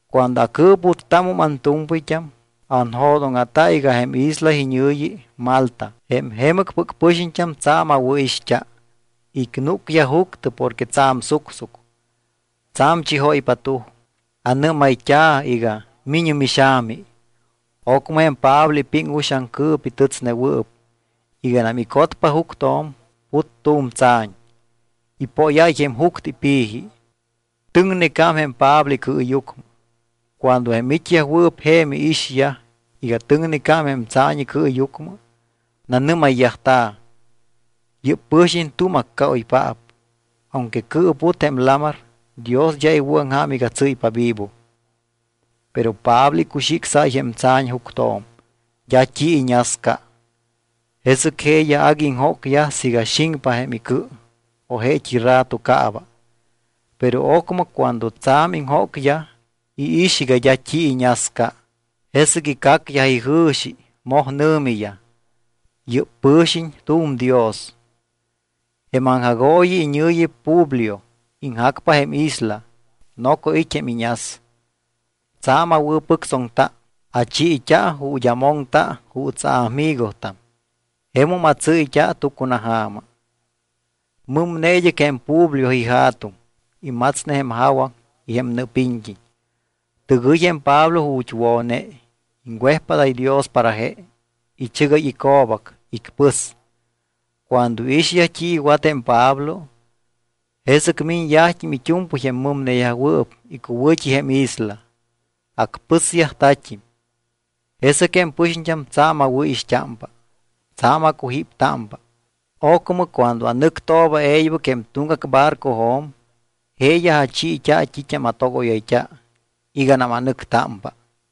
Cuando acɨɨputtámum antu̱mpɨyt́am, anjo̱dóŋa̱ta iga jém isla iñɨ̱yi Malta. Jém jemɨcpɨc pɨxiñt́am tsa̱m awɨ̱ixt́a. Icnúcyaj juctɨ porque tsa̱m sucsuc, tsa̱m chijóypa tuj. Anɨ́mayt́a̱ iga: “Mi̱ñɨ mixa̱mi.” Ocmɨ jém Pablo ipiŋ uxaŋ cɨ̱pi tɨtsnewɨɨp. Iganam icotpa juctjo̱m, put tu̱m tsa̱ñ, ipóyáy jém juctɨ ipi̱ji. Tɨŋnecám jém Pablo icɨɨyucmɨ. Cuando jém it́yajwɨɨp je̱m iixyaj iga tɨŋnecám jém tsa̱ñ icɨɨyucmɨ, nanɨ́mayyajta̱: —Yɨ́p pɨ̱xiñ tu̱m accaoypaap. Aunque cɨɨput jém lamar, Dios d́a iwɨ̱aŋja̱m iga tsɨ́ypa vivo. Pero Pablo icuxicsáy jém tsa̱ñ juctjo̱m. D́a t́i iñasca. Jesɨc jeeyaj agui iŋjócyaj siiga xiŋpa jém icɨ o jeet́i rato caaba. Pero ocmɨ cuando tsa̱m iŋjócyaj, iix iga d́a t́i iñasca. Jesɨc icacyaj ijɨ̱xi. Moj nɨ̱miyaj: —Yɨ́p pɨ̱xiñ tu̱m dios. Jém aŋjagooyi iñɨ̱yi Publio. Iŋjacpa jém isla. Noco it́ jém iñas. Tsa̱m awɨ̱pɨctsoŋta. Achiit́a ju̱t́ amoŋta juuts aamigotam. Jemum atsɨ́yt́a tucunaja̱ma. Mɨmne id́ɨc jém Publio ija̱tuŋ. Imatsne jém jawaŋ y jém nɨɨpiñt́iñ. Tɨgɨy jém Pablo ju̱t́ wo̱ne. Iŋwejpádáy Dios para je, ichɨgáy ico̱bac, icpɨs. Cuando iixyaj t́i iwat jém Pablo, jesɨc miñyajt́im it́u̱mpɨy jém mɨmneyajwɨɨp icuwɨ̱t́i jém isla. Acpɨsyajta̱t́im. Jesɨc jém pɨxiñt́am tsa̱m awɨ̱ixt́ámpa, tsa̱m acujíptámpa. Ocmɨ cuando anɨctooba e̱ybɨc jém tuŋgac barcojo̱m, jeeyaj achiit́a t́it́am atogóyayt́a iganam anɨctámpa.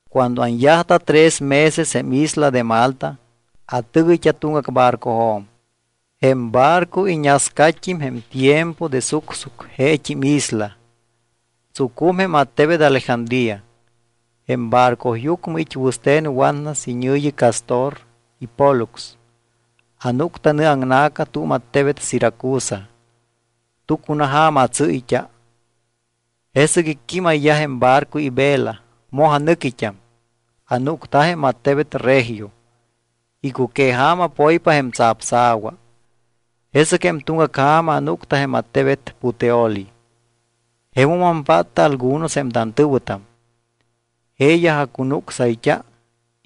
Cuando anyajta tres meses jém isla de Malta, atɨgɨyt́a tuŋgac barcojo̱m. Jém barco iñascat́im jém tiempo de sucsuc jeet́im isla. Tsucum jém attebet Alejandría. Jém barcoyucmɨ it́ wɨste̱n watnas iñɨ̱yi Cástor y Pólux. Anúcta nɨaŋna̱ca tu̱m attebet Siracusa. Tucunaja̱ma atsɨ́yt́a. Jesɨc icquímayyaj jém barco ivela, moj anɨquit́am. Anúcta jém attebet Regio. Icuqueja̱ma poypa jém tsapsa̱wa, jesɨc jém tuŋgac ja̱ma anúcta jém attebet Puteoli. Jemum ampátta algunos jém tantɨ̱wɨtam. Jeeyaj acunucsayt́a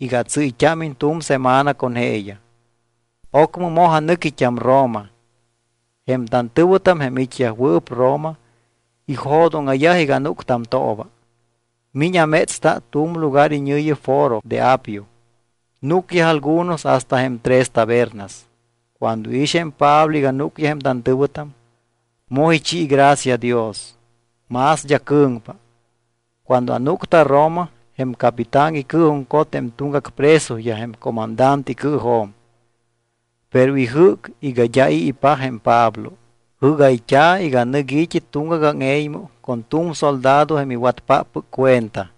iga atsɨ́yt́ámiñ tu̱m semana con jeeyaj. Ocmɨ moj anɨquit́am Roma. Jém tantɨ̱wɨtam jém it́yajwɨɨp Roma, ijo̱dóŋa̱yaj iga anúctamtooba, miñ amétsta tu̱m lugar iñɨ̱yi Foro de Apio. Núcyaj algunos hasta jém Tres Tabernas. Cuando iix jém Pablo iga núcyaj jém tantɨ̱wɨtam, moj ichi gracia Dios, más d́a cɨ̱ŋpa. Cuando anúcta Roma, jém capitán icɨɨjuŋcot jém tuŋgac presoyaj jém comandante icɨɨjo̱m. Pero ijɨ́c iga d́a i̱ ipaj jém Pablo. Jɨ́gayt́a̱ iga nɨc i̱t́i tuŋgac áŋe̱ymɨ con tu̱m soldado jém iwatpáppɨc cuenta.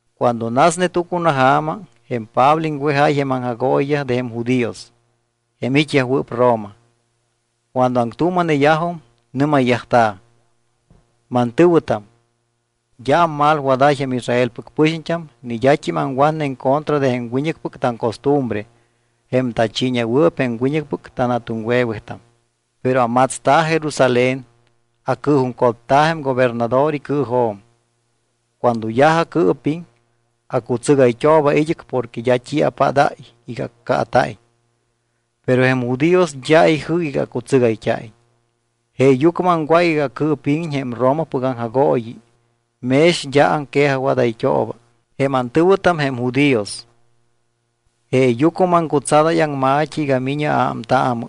Cuando nasne tucunaja̱ma, jém Pablo iŋwejáy jém aŋjagooyiyaj de jém judíos, jém it́yajwɨɨp Roma. Cuando aŋtuuma̱neyajum, nɨ́mayyajta̱: —Mantɨ̱wɨtam, d́a ammalwadáy jém Israelpɨc pɨxiñt́am ni d́at́im aŋwatne en contra de jém wiñɨcpɨc taŋcostumbre jém tachiiñewɨɨp jém wiñɨcpɨc tanja̱tuŋwe̱wetam. Pero amatsta̱ Jerusalén, acɨɨjuŋcotta̱ jém gobernador icɨɨjo̱m. Cuando yaj acɨɨpiŋ, acutsɨgayt́ooba id́ɨc porque d́a t́i apádáy iga accaata̱iñ. Pero jém judíos d́a ijɨ́c iga acutsɨgayt́a̱iñ. Jeeyucmɨ aŋwác iga acɨɨpíŋiñ jém Romapɨc aŋjagooyi mex d́a aŋquejajwadayt́ooba jém antɨ̱wɨtam jém judíos. Jeeyucmɨ maŋcutsadáy aŋma̱t́i iga mi̱ñɨ aámtaamɨ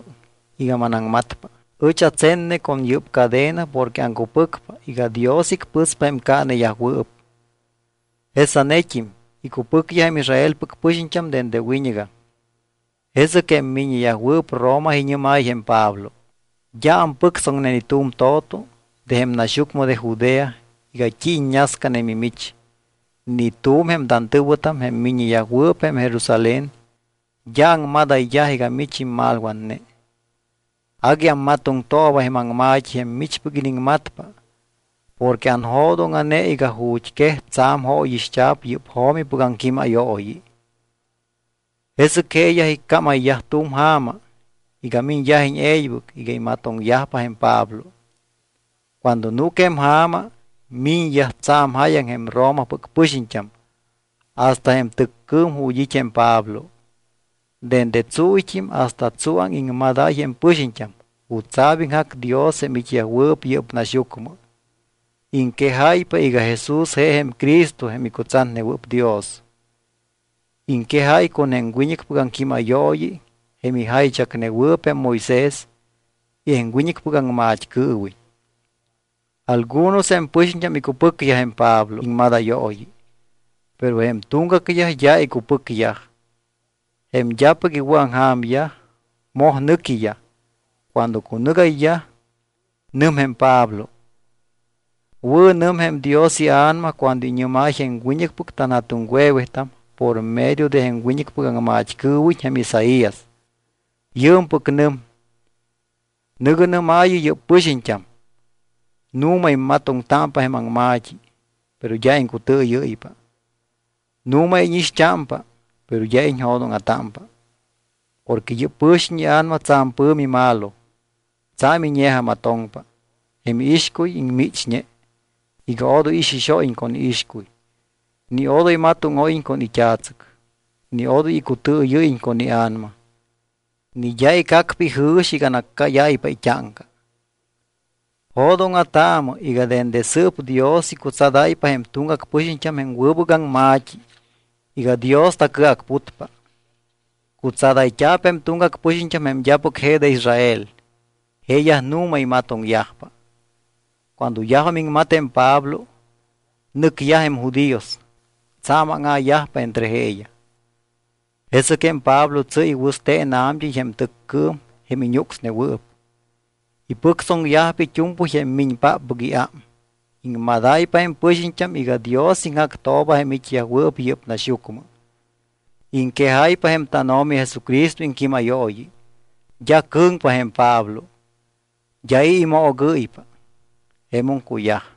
iga manaŋmatpa. Ɨch atsenne con yɨ́p cadena porque aŋcupɨcpa iga Dios icpɨspa jém caaneyajwɨɨp. Jesanet́im icupɨcyaj jém Israelpɨc pɨxiñt́am dende wiñɨgam. Jesɨc jém miññeyajwɨɨp Roma iñɨ́máy jém Pablo: —D́a ampɨctsoŋne ni tu̱m to̱to de jém naxyucmɨ de Judea iga t́i iññascane mimich. Ni tu̱m jém tantɨ̱wɨtam, jém miññeyajwɨɨp jém Jerusalén, d́a aŋmadayyaj iga mich immalwatne. Agui ammatoŋtooba jém aŋma̱t́i jém michpɨc iniŋmatpa porque anjo̱dóŋa̱ne iga ju̱t́ quej tsa̱m jóyixt́a̱p yɨ́p jo̱mipɨc aŋquímayooyi. Jesɨc jeeyaj icámayyaj tu̱m ja̱ma iga miñyajiñ e̱ybɨc iga imatoŋyajpa jém Pablo. Cuando núc jém ja̱ma, miñyaj tsa̱m jáyaŋ jém Romapɨc pɨxiñt́am hasta jém tɨccɨɨm ju̱t́ it́ jém Pablo. Dende tsúyt́im hasta tsuáŋ iŋmadáy jém pɨxiñt́am jutsa̱p iŋjac Dios jém it́yajwɨɨp yɨ́p naxyucmɨ. Iŋquejáypa iga Jesús je jém Cristo jém icutsatnewɨɨp Dios. Iŋquejáy con jém wiñɨcpɨc aŋquímayooyi jém ijaychacnewɨɨp jém Moisés y jém wiñɨcpɨc aŋmat́cɨɨwiñ. Algunos jém pɨxiñt́am icupɨcyaj jém Pablo iŋmadayooyi. Pero jém tuŋgacyaj d́a icupɨcyaj. Jém d́apɨc iwɨ̱aŋja̱myaj moj nɨquiyaj. Cuando cunɨgayyaj, nɨm jém Pablo: —Wɨ̱nɨm jém Dios iA̱nama cuando iñɨ́máy jém wiñɨcpɨc tanja̱tuŋwe̱wetam por medio de jém wiñɨcpɨc aŋmat́cɨɨwiñ jém Isaías. Yɨɨmpɨc nɨm: Nɨ̱gɨ nɨ́maayɨ yɨ́p pɨxiñt́am: Nu̱ma immatoŋtámpa jém aŋma̱t́i, pero d́a iŋcutɨɨyɨ́ypa. Nu̱ma íñixt́ámpa, pero d́a iñjo̱dóŋa̱támpa. Porque yɨ́p pɨxiñt́am ia̱nama tsa̱m pɨ̱mi malo, tsa̱m iñe̱jamatoŋpa, jém iixcuy iŋmichñe, iga odoy ixixóyiñ con iixcuy, ni odoy matóŋóyiñ con it́a̱tsɨc, ni odoy icutɨɨyɨ́yiñ con ia̱nama, ni d́a icacpa ijɨ̱xi iga anaccáyáypa it́áŋca. Jo̱dóŋa̱taamɨ iga dende sɨɨp Dios icutsadáypa jém tuŋgac pɨxiñt́am jém wɨbɨc aŋma̱t́i iga Dios tacɨacputpa. Cutsadayt́a̱p jém tuŋgac pɨxiñt́am, jém d́apɨc je de Israel. Jeeyaj nu̱ma imatoŋyajpa. Cuando yajum iŋmat jém Pablo, nɨcyaj jém judíos. Tsa̱m áŋa̱yajpa entre jeeyaj. Jesɨc jém Pablo tsɨ́y wɨste̱n a̱mt́ɨy jém tɨccɨɨm jém iñúcsnewɨɨp. Ipɨctsoŋyajpa it́u̱mpɨy jém miñpáppɨc iám. Iŋmadáypa jém pɨxiñt́am iga Dios iŋjactooba jém it́yajwɨɨp yɨ́p naxyucmɨ. Iŋquejáypa jém tánO̱mi Jesucristo iŋquímayooyi. D́a cɨ̱ŋpa jém Pablo, d́a i̱ imoogɨ́ypa. Jemum cuyaj.